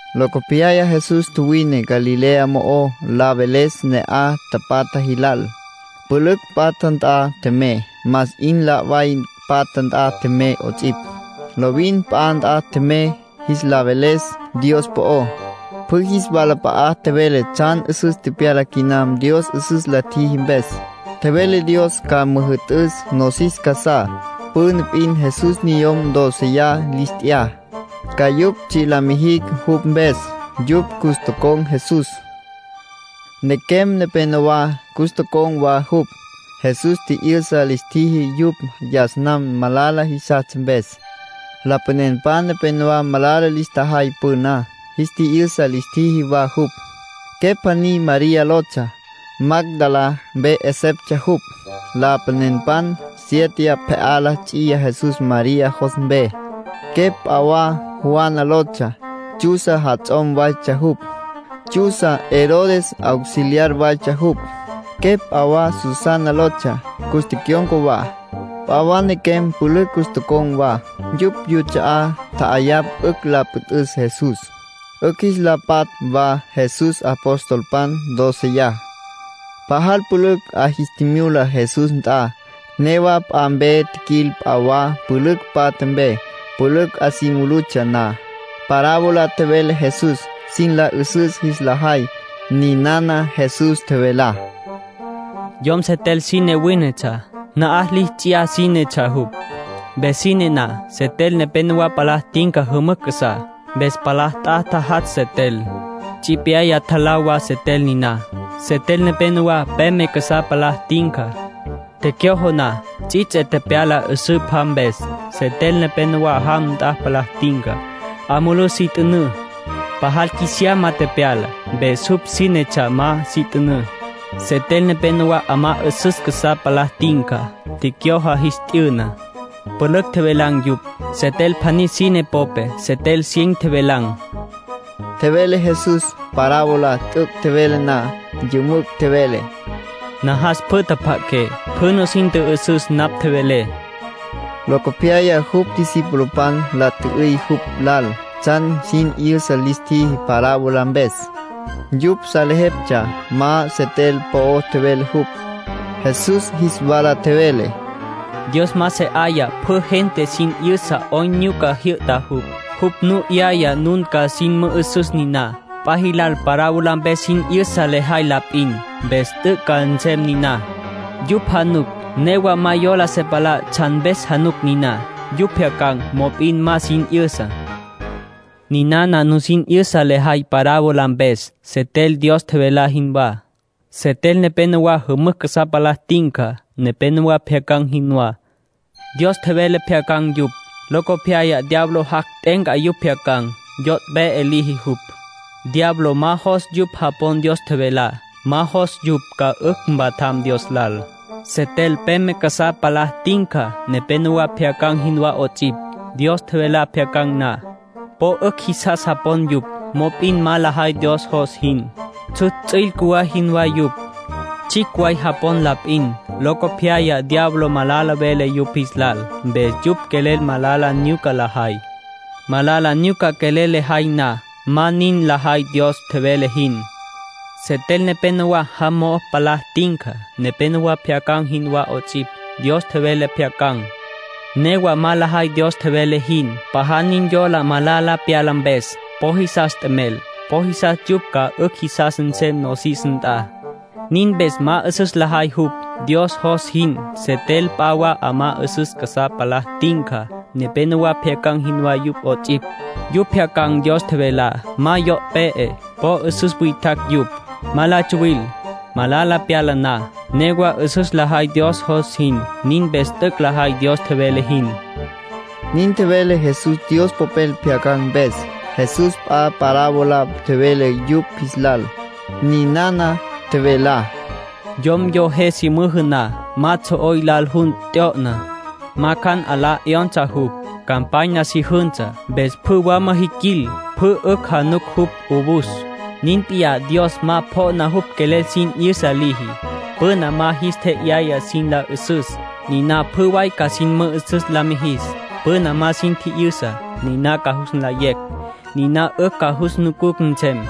Locopyaya Jesús tjuwine Galilea mo'ó la veles ne'aj tapatja jilal. Pülücj patja nt'a tjemey, más 'in la' way patja nt'a tjemey 'ots'ipj. Lovin p'a nt'a tjemey jis lal la veles Dios po'ó. Pjü jis walap'a'a tjevele tsjan 'üsüs tepyala quinam Dios 'üsüs la tjiji mpes. Tjevele Dios ca müjü'tüs nosis casá. Püna p'in Jesús niyom dóceya lis t'ya, ca yupj tsji' la mijicj jupj mpes. Yupj cus tocon̈ Jesús. Nequem nepenowá cus tocon̈ wa jupj. Jesús tji'yü'sa lis tjiji yupj yas nam malala jisastsja mpes. Lapanenpan nepénowa malala lis tjajay püná. Jis tji'yü'sa lis tjiji wa jupj. Quepj pjaní María lotsja. Magdalá mpe 'eseptsja jupj. Lapanenpan siéteya pje'á la ts'iya Jesús María jos mpe. Quepj p'a wa Juana lotsja. Chuza jats'om waytsja jupj. Chuza Herodes auxiliar waytsja jupj. Quepj p'a wa Susana lotsja. Cus tecyon̈ca wa. P'a wa nequem pülücj cus tocon̈ wa. Yupj yuts'a'á tja'ayapj 'ücj la püt'üs Jesús, 'ücj jis la patj wa Jesús apostolpan dóceya. Pajal pülücj 'a jis tjimyula Jesús nt'a. Newa p'a mpe tjiquil p'a wa pülücj patja mpe. Pülücj 'a si mulutsja na, parábola tjevele Jesús, sin la 'üsüs jis la jay. Ninana Jesús tjevelá: “Yom setel sine wínetsja. Na'aj li ts'iyá sínetsja jupj. Mpes sine na, setel nepenowá palá tinca jümücj casá. Mpes palá ta'á tjajatsj setel. Tsipyaya tjalá wa setel niná. Setel nepenowá peme casá palá tinca. Tecyojo na, ts'its'e tepyala 'üsǘ pja mpes. Setel nepenowá jam nt'a palá tinca. 'A mulú si t'ünǘ. Pajal qjuisiyama tepyala, mpes jupj sínetsja ma si t'ünǘ. Setel nepenowá 'amá 'üsüs casá palá tinca. Tecyojo, jis t'yüna. Pülücj tjevelan̈ yupj. Setel pjaní sine popé setel cien tjevelan̈”, tjevele Jesús. Parábola t'üc' tjevele na, yümücj tjevele: “Najas pjü tjapja'aqué, pjü nusin tjü'üsüs napj tjevelé”. Locopyaya jupj discipulopan la tjü'üy jupj lal tsjan sin 'yüsa lis tjiji parábola mpes. Yupj salejeptsja ma setel po'o tjevele jupj. Jesús jis wala tjevele: “Dios ma se 'aya pjü gente sin 'yüsa 'oyn nyuca jyü'ta jupj. Jupj nu 'yaya nun ca nusin mü'üsüs niná. P'a jilal parábola mpes sin 'yüsa lejay la p'in. Mpes t'üc' ca nsem niná: ‘Yupj januc, newa ma yola se palá tsjan mpes januc niná. Yupj pjyacan̈, mop'in ma sin 'yüsa.’ ”Ninana nusin 'yüsa lejay parábola mpes: setel Dios tjevelá jinwá. Setel nepenowá jümücj casá palá tinca, nepénowa pjyacan̈ jinwá. Dios tjevele tjepjyacan̈ yupj. Locopyaya diablo jac', t'e'enca yupj tjepjyacan̈. Yo' pe'e liji jupj. Diablo ma jos yupj japon Dios tjevelá. Ma jos yupj ca 'ücj mpatjam Dios lal. ”Setel peme casá palá tinca, nepénowa pjyacan̈ jinwá 'ots'ipj. Dios tjevelá pjyacan̈ na, po 'ücj jisas japon yupj. Mop'in ma lajay Dios jos jin. Tsjutsj ts'üil cjuwá jinwá yupj. Tsjicj way japon la p'in. Locopyaya diablo malala vele yupj jis lal, mpes yupj quelel malala nyuca lajay. Malala nyuca quelel lajay na, ma nin lajay Dios tjevele jin. ”Setel nepenowá jam mo'o palá tinca, nepénowa pjyacan̈ jinwá 'ots'ipj. Dios tjevele tjepjyacan̈. Newa ma lajay Dios tjevele jin. Pajal nin yola malala pyala mpes. Po jisas t'emel. Po jisas yupj ca 'ücj jisas nsem nosis nt'a. Nin mpes ma 'üsüs lajay yupj, Dios jos jin. ”Setel p'a wa 'amá 'üsüs casá palá tinca, nepénowa pjyacan̈ jinwá yupj 'ots'ipj. Yupj pjyacan̈ Dios tjevelá. Ma yo' pe'e. Po 'üsüs witjacj yupj. Ma la tsuwil. Malala pyala na, newa 'üsüs lajay Dios jos jin. Nin mpes t'üc' lajay Dios tjevele jin”, nin tjevele Jesús Dios Popel pjyacan̈ mpes. Jesús p'a parábola tjevele yupj jis lal. Ninana tjevelá: “Yom yo je si müjü na, ma tsjo'oy lal jun t'yo'na. Ma cjan 'alá 'yonsa jupj. Campanya si jünsa, mpes pjü wama jiquil pjü 'ücj januc jupj 'owus. Nin p'iyá Dios ma pjo'na jupj quelel sin 'yüsa liji. Püna ma jis tje'yaya sin la 'üsüs, niná pjü way ca sin mü'üsüs la mijis. Püna ma sin tji'yüsa, niná ca jus nlayecj. Niná 'ücj ca jus nucucj nsem.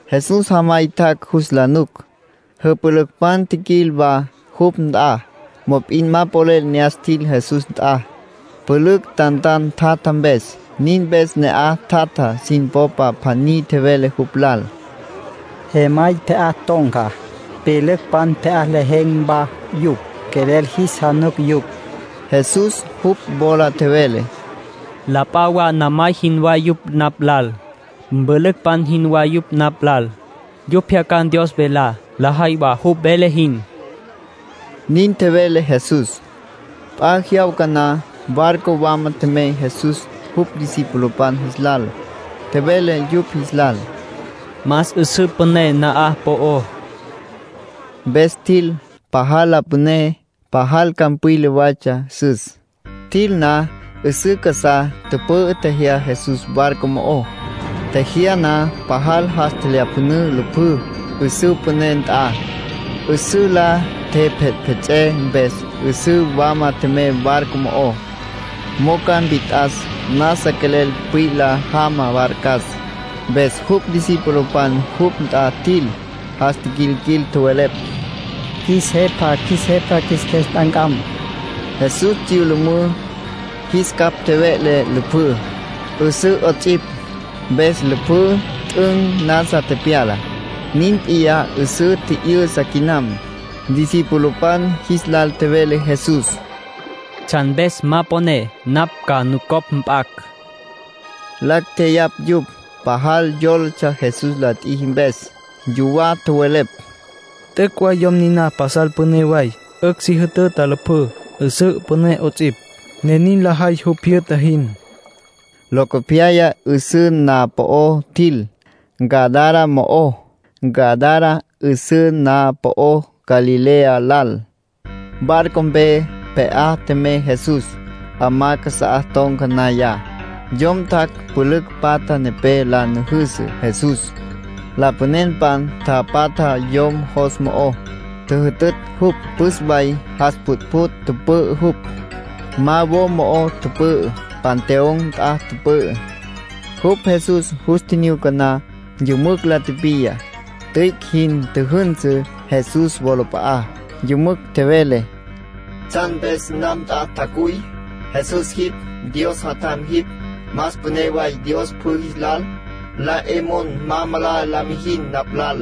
Jesús jamay tjac' jus la nuc, jüpülücpan tjiquil wa jupj nt'a. Mop'in ma polel ne'as tjil Jesús nt'a, pülücj tantan tjatja mpes. Nin mpes ne'aj tjatja sin popa pjaní tjevele jupj lal: —Jemay pje'á ton̈ca, pyülücpan pje'á lejen̈ wa yupj. Quelel jis januc yupj. Jesús jupj wola tjevele: —La p'a wa namay jinwá yupj napj lal, mpülücpan jinwá yupj napj lal. Yupj pjyacan̈ Dios velá, lajay wa jupj vele jin —nin tjevele Jesús. P'a jyawca na, barco wama tjemey Jesús jupj discipulopan jis lal. Tjevele yupj jis lal: —Mas 'üsǘ püné na'aj po'ó. Mpes tjil. Pajal la püné, pajal campwila waytsja 'üsüs. Tjil na 'üsǘ casá, tüpü'ü, tjejyá Jesús barco mo'ó. Tjejyá na, pajal jas tjelyapjünǘ lüpjüs 'üsǘ püné nt'a. 'Üsǘ la tjepjetpjets'é mpes 'üsǘ wama tjemey barco mo'ó, mo'o ca mpit'as. Nasa quelel pwila jama barcas. Mpes jupj discipulopan jupj nt'a tjil, jas tiquilquil, tjowelepj: —Qjuis Jepa, qjuis Jepa, qjuis qjues nt'ancam. Jesús tsyülümǘ, jis capj tjeve'le lüpjǘ, 'üsǘ 'ots'ipj. Mpes lüpjǘ 'üt'ün nasa tepyala. Nin p'iyá 'üsǘ tji'yü'sa quinam. Discipulopan jis lal tjevele Jesús: —¿Tsjan mpes ma poné napj ca nucopj mp'acj? Lacj tjeyapj yupj. Pajal yólatsja Jesús la tjiji mpes. Yuwá tjowelepj: “T'üc' way yom niná pasal püné way. 'Ücj si jütüta lüpjǘ, 'üsǘ püné 'ots'ipj, ne nin lajay jupj jyü'ta jin.” Locopyaya 'üsǘ na'aj po'ó tjil, Gadara mo'ó. Gadara 'üsǘ na'aj po'ó Galilea lal. Barco mpe pje'á tjemey Jesús. 'Amá casá ton̈ca naya, yom tjac' pülücj patja nepé la nüjüsü Jesús. Lapanenpan tapatja yom jos mo'ó, tjüjütütj jupj. Püs way jas pjütpjüt' tüpü'ü jupj. Ma wo mo'ó tüpü'ü; panteón nt'a tüpü'ü. Jupj Jesús jus tjinyuca na, yümücj la tipiya, tüic' jin tjüjünsü Jesús wolap'a'á. Yümücj tjevele: —¿Tsjan mpes napj nt'a tjacuy? Jesús jipj. Dios Jatjam jipj. Más püné way Dios pjü jis lal. La 'e mon ma malala la mijin napj lal.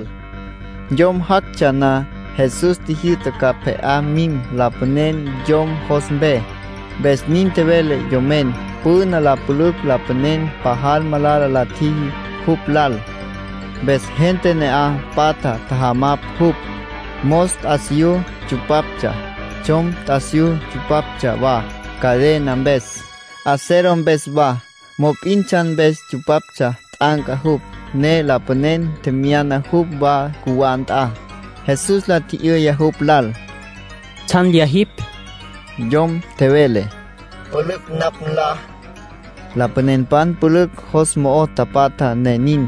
Yom jactsja na, Jesús tjijyü'ta ca pje'á mim lapanen yom jos mpe, mpes nin tjevele yomen. Püna la pülücj lapanen pajal malala la tjiji jupj lal, mpes gente ne'aj patja tjajamapj jupj. Mos t'asiyú tsupaptsja, tsjom t'asiyú tsupaptsja wa cadena mpes, acero mpes wa. Mop'in tsjan mpes tsupaptsja t'anca jupj, ne lapanen tjemyana jupj wa cjuwá nt'a. Jesús la tji'yüya jupj lal: —¿Tsjan lyá jipj? Yom tjevele: —‘Pülücj’ napj nlá. Lapanenpan pülücj jos mo'o tapatja ne nin.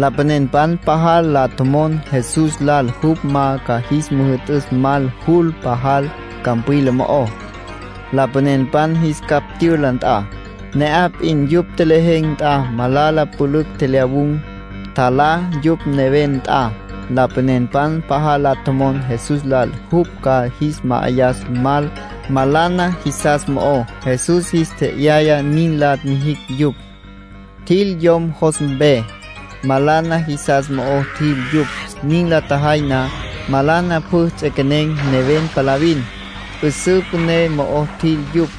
Lapanenpan pajal la tjomon Jesús lal jupj ma ca jis müjü'tüs mal jul pajal campwila mo'ó, lapanenpan jis capj tyüla nt'a. Ne'aj p'in yupj tjelejen̈ nt'a malana pülücj tjelyawun̈, tjalá yupj neven nt'a. Lapanenpan pajal la tjomon Jesús lal jupj ca jis ma'ayas mal malana jisas mo'ó. Jesús jis tje'yaya nin la mijicj yupj. Tjil yom jos mpe. Malana jisas mo'o tjil yupj. Nin la tjajay na, malana pjü ts'equenen̈ neven palavin; 'üsǘ püné mo'o tjil yupj.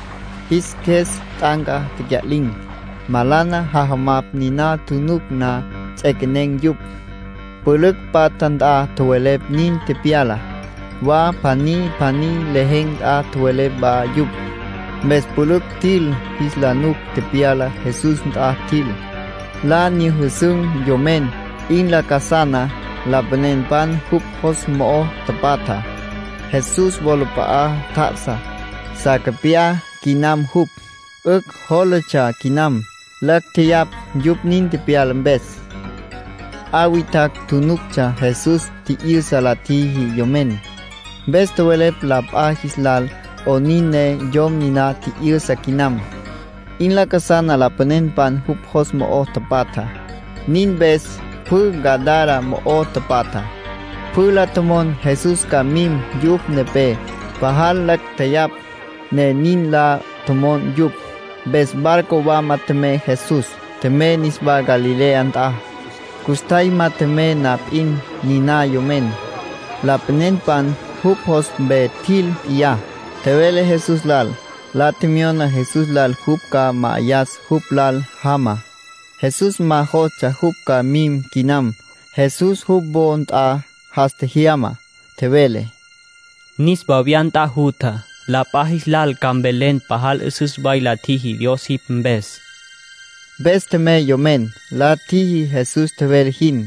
Jis qjues t'anca, tecya'lin̈. Malana jajamapj niná tjunuc na, ts'equenen̈ yupj. Pülücj patja nt'a tjowelepj nin tepyalá. Wa pjaní pjaní lejen̈ nt'a tjowelepj wa yupj. Mpes pülücj tjil jis la nuc tepyalá. Jesús nt'a tjil. La nyüjüsün̈ yomen, 'in lacasana lapanenpan jupj jos mo'o tapatja. Jesús wolap'a'a tjá'asa. Sacapyá quinam jupj, 'ücj jólatsja quinam. Lacj tjeyapj yupj nin tepyala mpes. P'a witjacj tjunuctsja Jesús tji'yü'sa la tjiji yomen. Mpes tjowelepj la p'a jis lal 'onin ne yom niná tji'yü'sa quinam. 'In lacasana lapanenpan jupj jos mo'o tapatja. Nin mpes pjü Gadara mo'o tapatjá, pjü la tjomon Jesús ca mim yupj nepé. Pajal lacj tjeyapj, ne nin la tjomon yupj. Mpes barco wama tjemey Jesús, tjemey niswá Galilea nt'a. Custjay ma tjemey na p'in, niná yomen, lapanenpan jupj jos mpe tjil p'iyá, tjevele Jesús lal. La tjemyona Jesús lal jupj ca ma'ayas jupj lal jama. Jesús ma jostsja jupj ca mim quinam. Jesús jupj wo nt'a jas tjejyama, tjevele: —Niswa wya nt'a jutja. La p'a jis lal ca mvelen pajal 'üsüs way la tjiji Dios jipj mpes. Mpes tjemey yomen, la tjiji Jesús tjevele jin.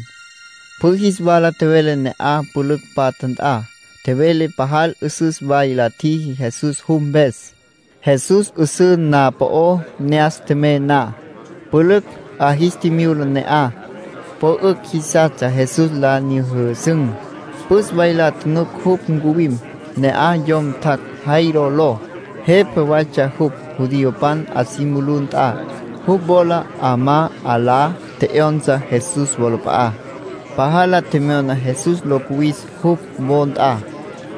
Pjü jis wala tjevele ne'aj pülücj patja nt'a. Tjevele pajal 'üsüs way la tjiji Jesús jupj mpes. Jesús 'üsǘ na'aj po'ó ne'as tjemey na, pülücj 'a jis tjimyula ne'aj. Po 'ücj jisastsja Jesús la nyüjüsün̈. Püs way la tjunuc jupj ncuwim. Ne'aj yom tjac' Jairo ló. Jepa waytsja jupj judiopan 'a si mulú nt'a. Jupj wola 'amá 'alá tje'yonsa Jesús wolap'a'á. Pajal la tjemyona Jesús lo cuwis jupj wo nt'a.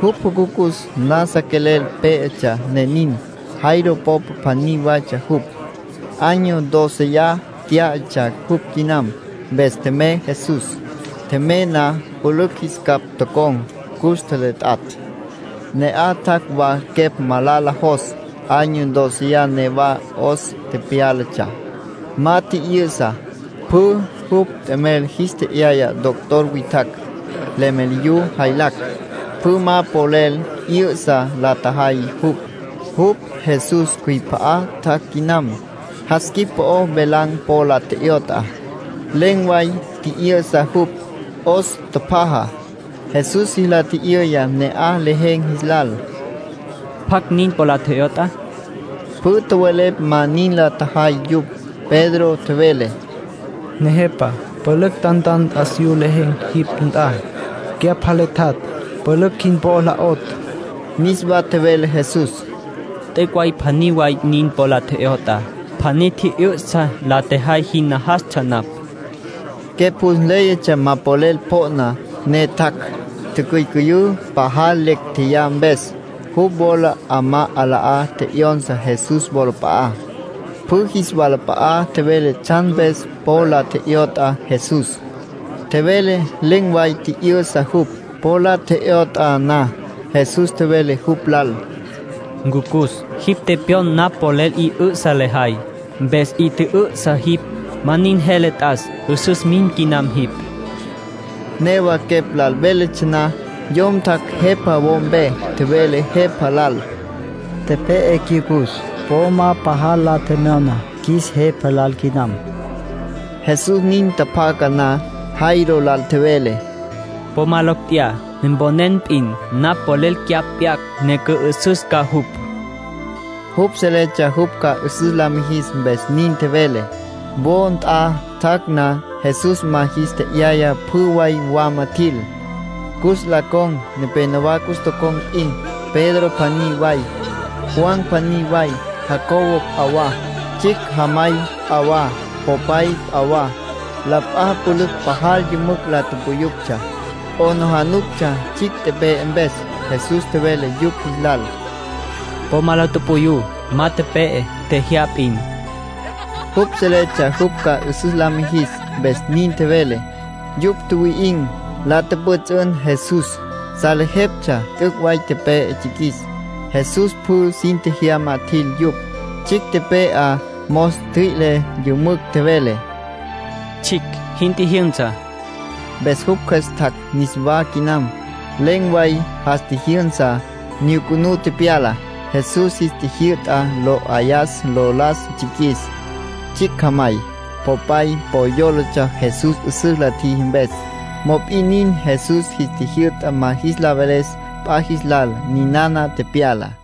Jupj jucucus nasa quelel pé'etsja ne nin. Jairo popa pjaní waytsja jupj, año dóceya tyá'atsja jupj quinam. Mpes tjemey Jesús. Tjemey na, pülücj jis capj tocon̈, cus tjeletjatj. Ne'aj tjac' wa quepj malala jos. Año dóceya newa 'os tepyálatsja, ma tji'yü'sa. Pjü jupj t'emel jis tje'yaya doctor witjacj, leméliyu jaylacj. Pjü ma polel 'yü'sa la tjajay jupj. Jupj Jesús cjüip'a'a tjac' quinam, jas quip po'o velan̈ po la tje'yot'a. Len̈ way tji'yü'sa jupj. 'Os tjapjaja. Jesús jis la tji'yüya ne'aj lejen̈ jis lal: —¿Pjacj nin po la tje'yot'a? Pjü tjowelepj ma nin la tjajay yupj. Pedro tjevele: —Nejepa, pülücj tantan t'asiyú lejen̈ jipj nt'a, cyapj jaletjatj. Pülücj jin po la 'otj. Niswa tjevele Jesús: —T'üc' way pjaní way nin po la tje'yot'a. Pjaní tji'yü'sa la tjejay jin najastsja napj. Quepj jus nléyatsja ma polel pjo'na, ne tjac'. Ticyücüyǘ, pajal lecj tjeyá mpes. Jupj wola 'amá 'alá tje'yonsa Jesús wolap'a'á. Pjü jis walap'a'a tjevele tsjan mpes po la tje'yot'a Jesús. Tjevele len̈ way tji'yü'sa jupj, po la tje'yot'a na. Jesús tjevele jupj lal: —Ncucus, jipj tepyon napj polel 'i 'ü'sa lejay, mpes 'i tjü'ü'sa jipj. Ma nin jele t'as. 'Üsüs mim quinam jipj. Newa quepj lal véletsja na, yom tjac' jepa wo mpe, tjevele jepa lal: —Tepe'e cyucus. Po ma pajal la tjemyona qjuis Jepa lal quinam. Jesús nin tjapjaca na, Jairo lal tjevele: —Po ma lecj tjeyá. Mponen p'in napj polel cyapj p'yacj ne cü'ü'süs ca jupj. (Jupj seletsja jupj ca 'üsüs la mijis, mpes nin tjevele.) Wo nt'a tjac' na, Jesús ma jis tje'yaya pjü way wama tjil, cus la con̈. Nepénowa cus tocon̈ p'in, Pedro pjaní way, Juan pjaní way, Jacobo p'a wa, tsjicj jamay p'a wa, popay p'a wa. La p'a pülücj pajal yümücj la puyuptsja. 'Aplijílatsja tsjicj tepe'e mpes. Jesús tjevele yupj jis lal: —Po ma la tupuyú. Ma tepe'e, tjejyá p'in. (Jupj seletsja jupj ca 'üsüs la mijis, mpes nin tjevele.) Yupj tjuwi'in̈, la tjüpjüts'ün Jesús. Salejeptsja t'üc' way tepe'e tsjiquis. Jesús pjü sin tjejyama tjil yupj. Tsjicj tepe'á mos ntjüi'le, yümücj tjevele: —Tsjicj, jin tjijyünsa. Mpes jupj cjües tjac' niswá quinam. Len̈ way jas tjijyünsa, nyucunú tepyala. Jesús jis tjijyü'ta lo 'ayas lo las tsjiquis. Tsjicj jamay, popay po yólatsja Jesús 'üsüs la tjiji mpes, mop'in nin Jesús jis tjijyü'ta ma jis la veles p'a jis lal ninana tepyalá.